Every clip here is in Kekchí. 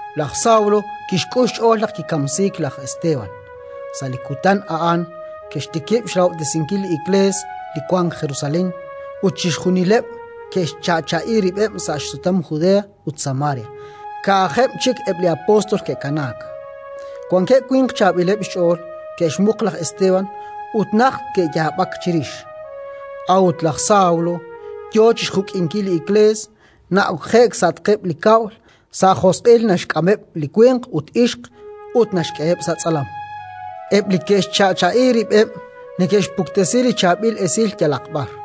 Laj Sawlo kixk'ul xch'ool naq kikamsiik laj Esteban. Sa' li kutan a'an ke'xtikib' xrahob'tesinkil li Iklees li wank Jerusalén, ut chixjunileb' ke'xcha'cha'i rib'eb' sa' xsutam Judea ut Samaria, ka'ajeb' chik eb' li apóstol ke'kanaak. Wankeb' winq chaab'ileb' xch'ool ke'xmuq laj Esteban ut najt ke'yaab'ak chirix. A'ut laj Sawlo yo chi xjuk'inkil li Iklees: na'okje'k sa'atqeb' li kab'l, sa' josq'il naxk'ameb' li winq ut ixq, ut naxk'eheb' sa' tz'alam. Eb' li ke'xcha'cha'i rib'eb' neke'xpuktesi li chaab'il esil yalaq b'ar.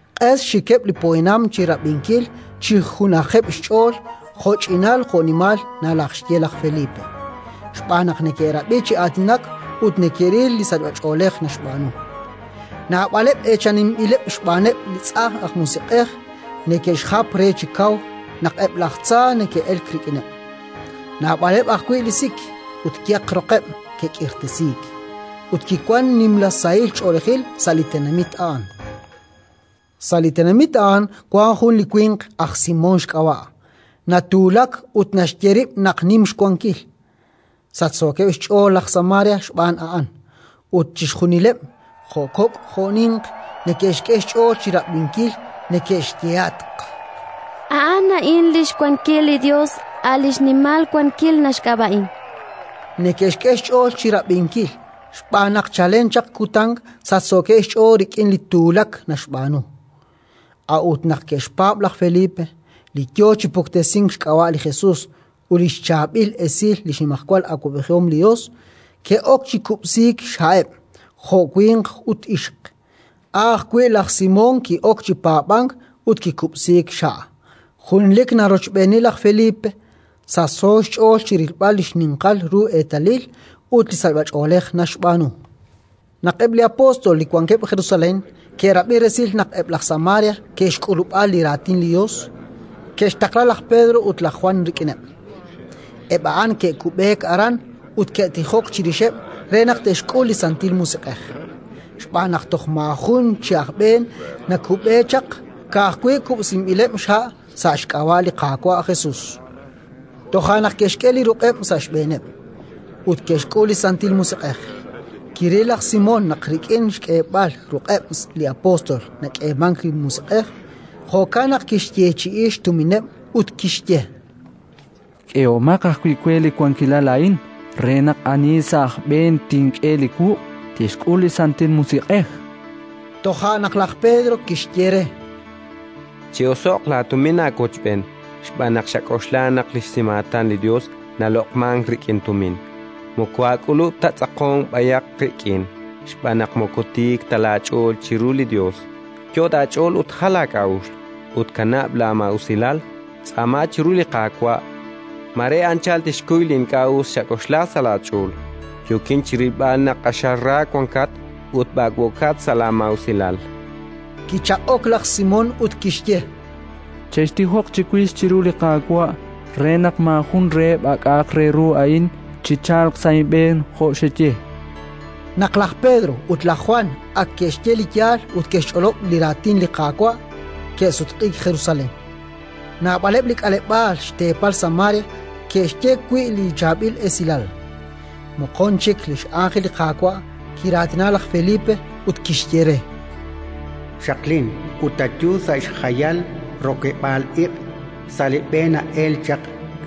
Q'es xxikeb' li poyanam chi rab'inkil chi junajeb' xch'ool jo'ch'inal jo'nimal nalajxye laj Felipe, xb'aan naq neke'rab'i chi aatinak ut neke'ril li sachb'ach'oolej naxb'aanu. Naab'aleb' eechaninb'ileb' xb'aaneb' li tz'ajn aj musiq'ej neke'xjap re chi kaw naq eb' laj tza neke'elk rik'ineb'; naab'aleb' ajwi' li sik ut yeq roqeb' ke'k'irtasiik. Ut kiwank nimla sahil ch'oolejil sa' li tenamit a'an. Sa' li tenamit a'an wank jun li winq, aj Simón xk'ab'a', natuulak ut naxye rib' naq nim xwankil: sachsookeb' xch'ool laj Samaria xb'aan a'an, ut chixjunileb', jo' kok' jo' ninq, neke'xk'e xch'ool chi rab'inkil; neke'xyehatq: “A'an a'in li xwankil li Yos, a' li xNimal Wankil naxk'ab'a'in”. Neke'xk'e xch'ool chi rab'inkil xb'aan naq chalen chaq kutan sachsookeb' xch'ool rik'in li tuulak naxb'aanu. A'ut naq ke'xpaab' laj Felipe, li yo chi puktesink xk'ab'a' li Jesus ut li xChaab'il Esil li xnimajwal awab'ejihom li Yos, ke'ok chi kub'siik xha'eb', jo' winq ut ixq. A' ajwi' laj Simón ki'ok chi paab'ank ut kikub'siik xha'; junelik narochb'eeni laj Felipe, sachso xch'ool chi rilb'al li xninqal ru eetalil ut li sachb'ach'oolej naxb'aanu. Naq eb' li apóstol li wankeb' Jerusalén ke'rab'i resil naq eb' laj Samaria ke'xk'ulub'a li Raatin li Yos, ke'xtaqla laj Pedro ut laj Jwan rik'ineb'. Eb' a'an ke'kub'eek aran ut ke'tijok chirixeb' re naq te'xk'ul li Santil Musiq'ej; xb'aan naq toj maajun chi aj b'een nakub'e chaq, ka'ajwi' kub'sinb'ileb' xha' sa' xk'ab'a' li Qaawa' Jesus. Toja' naq ke'xk'e li ruq'eb' sa' xb'eeneb', ut ke'xk'ul li Santil Musiq'ej. Kiril laj Simón naq rik'in xk'eeb'al ruq'eb' li apóstol nak'eemank li Musiq'ej; jo'kan naq kixyeechi'i xtumineb' ut kixye: —K'ehomaq ajwi' we li wankilal a'in re naq ani sa' aj b'een tink'e li wuq' tixk'ul li Santil Musiq'ej. Toja' naq laj Pedro kixye re: —Chi'oso'q laatumin aawochb'een, xb'aan naq xak'oxla naq li xsimaatan li Yos naloq'mank rik'in tumin. Moko aak'ulub' ta tz'aqonk b'ayaq qik'in, xb'aan naq moko tiik ta laach'ool chiru li Yos. Yot' aach'ool ut jal laak'a'uxl, ut kanab' laamaa'usilal; tz'aaman chiru li Qaawa': mare anchal tixkuy li ink'a' us xak'oxla sa' laach'ool. Yookin chi rilb'al naq q'axal ra wankat ut b'ak'b'ookat sa' laamaa'usilal. Kichaq'ok laj Simón, ut kixye: —Chextijoq chiwix chiru li Qaawa' re naq maajun reheb' a k'a'aq re ru a'in chichalq sa' inb'een, jo' xeye. Naq laj Pedro ut laj Jwan ak ke'xye li yaal ut ke'xch'olob' li Raatin li Qaawa', ke'sutq'iik Jerusalén, naab'aleb' li k'aleb'aal xteepal Samaria ke'xye wi' li Chaab'il Esilal. Moqon chik li x'ánjel li Qaawa' kiraatina laj Felipe, ut kixye re: “Xaqlin ut ayu sa' xjayal rokeb'l iq', sa' li b'e na'elk chaq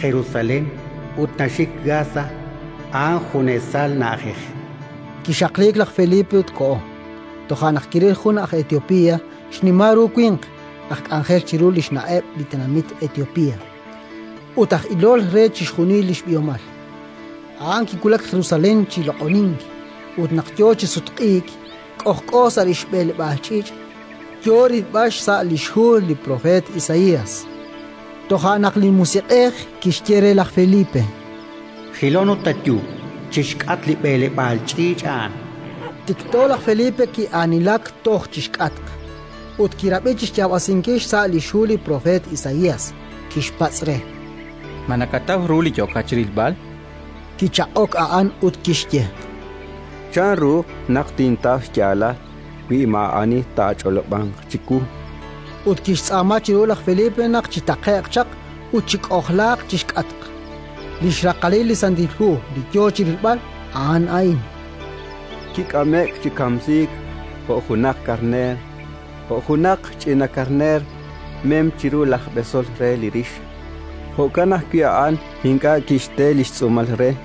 Jerusalén ut naxik Gasa; a'an junesal na'ajej”. Kixaqliik laj Felipe ut koho. Toja' naq kiril jun aj Etiopía, xnimal ru winq, aj k'anjel chiru li xNa'eb' li tenamit Etiopía, ut aj ilol re chixjunil li xb'ihomal. A'an kiwulak Jerusalén chi loq'onink ut naq yo chi sutq'iik, k'ojk'o sa' li xb'eleb'aal ch'iich', yo rilb'al xsa' li xhu li propeet Isaías. Toja' naq li Musiq'ej kixye re laj Felipe: “Jilon ut ayu chi xk'atq li b'eleb'aal ch'iich' a'an”. Tikto laj Felipe ki'aanilak toj chi xk'atq, ut kirab'i chi xyaab'asinkil xsa' li xhu li propeet Isaías. Kixpatz' re: —Ma nakataw ru li yookat chi rilb'al? chan. Kichaq'ok a'an, ut kixye: —Chanru naq tintaw xyaalal wi maa'ani taach'olob'anq chiwu? Ut kixtz'aama chiru laj Felipe naq chitaqe'q chaq ut chik'ojlaaq chi xk'atq. Li xraqalil li Santil Hu li yo chi rilb'al a'an a'in: “Kik'ame'k chi kamsiik jo' junaq karneer. Jo' junaq ch'ina karneer, mem chiru laj b'esol re li rix, jo'kan ajwi' a'an ink'a' kixte li xtz'uumal re.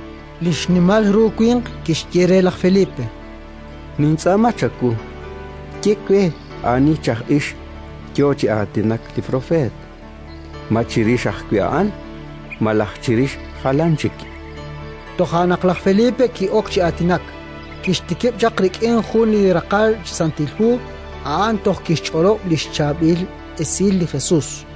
Li xnimal ru winq kixye re laj Felipe: —Nintz'aama chawu, ye we ani chi aj ix yo chi aatinak li propeet: ma chirix ajwi' a'an, malaj chirix jalan chik? Toja' naq laj Felipe ki'ok chi aatinak, kixtikib' chaq rik'in li jun raqal chi Santil Hu a'an toj kixch'olob' li xChaab'il Esil li Jesus.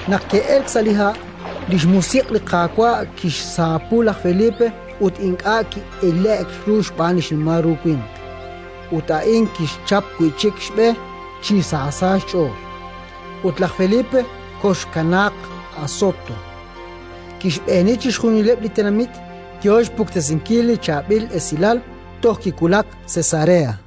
Naq ke'elk sa' li ha', li xMusiq' li Qaawa' kixsaapu laj Felipe ut ink'a' chik ki'ile'k ru xb'aan li xnimal ru winq. Ut a'in kixchap wi' chik xb'e chi sa sa' xch'ool, ut laj Felipe koxkanaaq Asoto; kixb'eeni chixjunileb' li tenamit, yo xpuktesinkil li Chaab'il Esilal toj kiwulak Cesarea.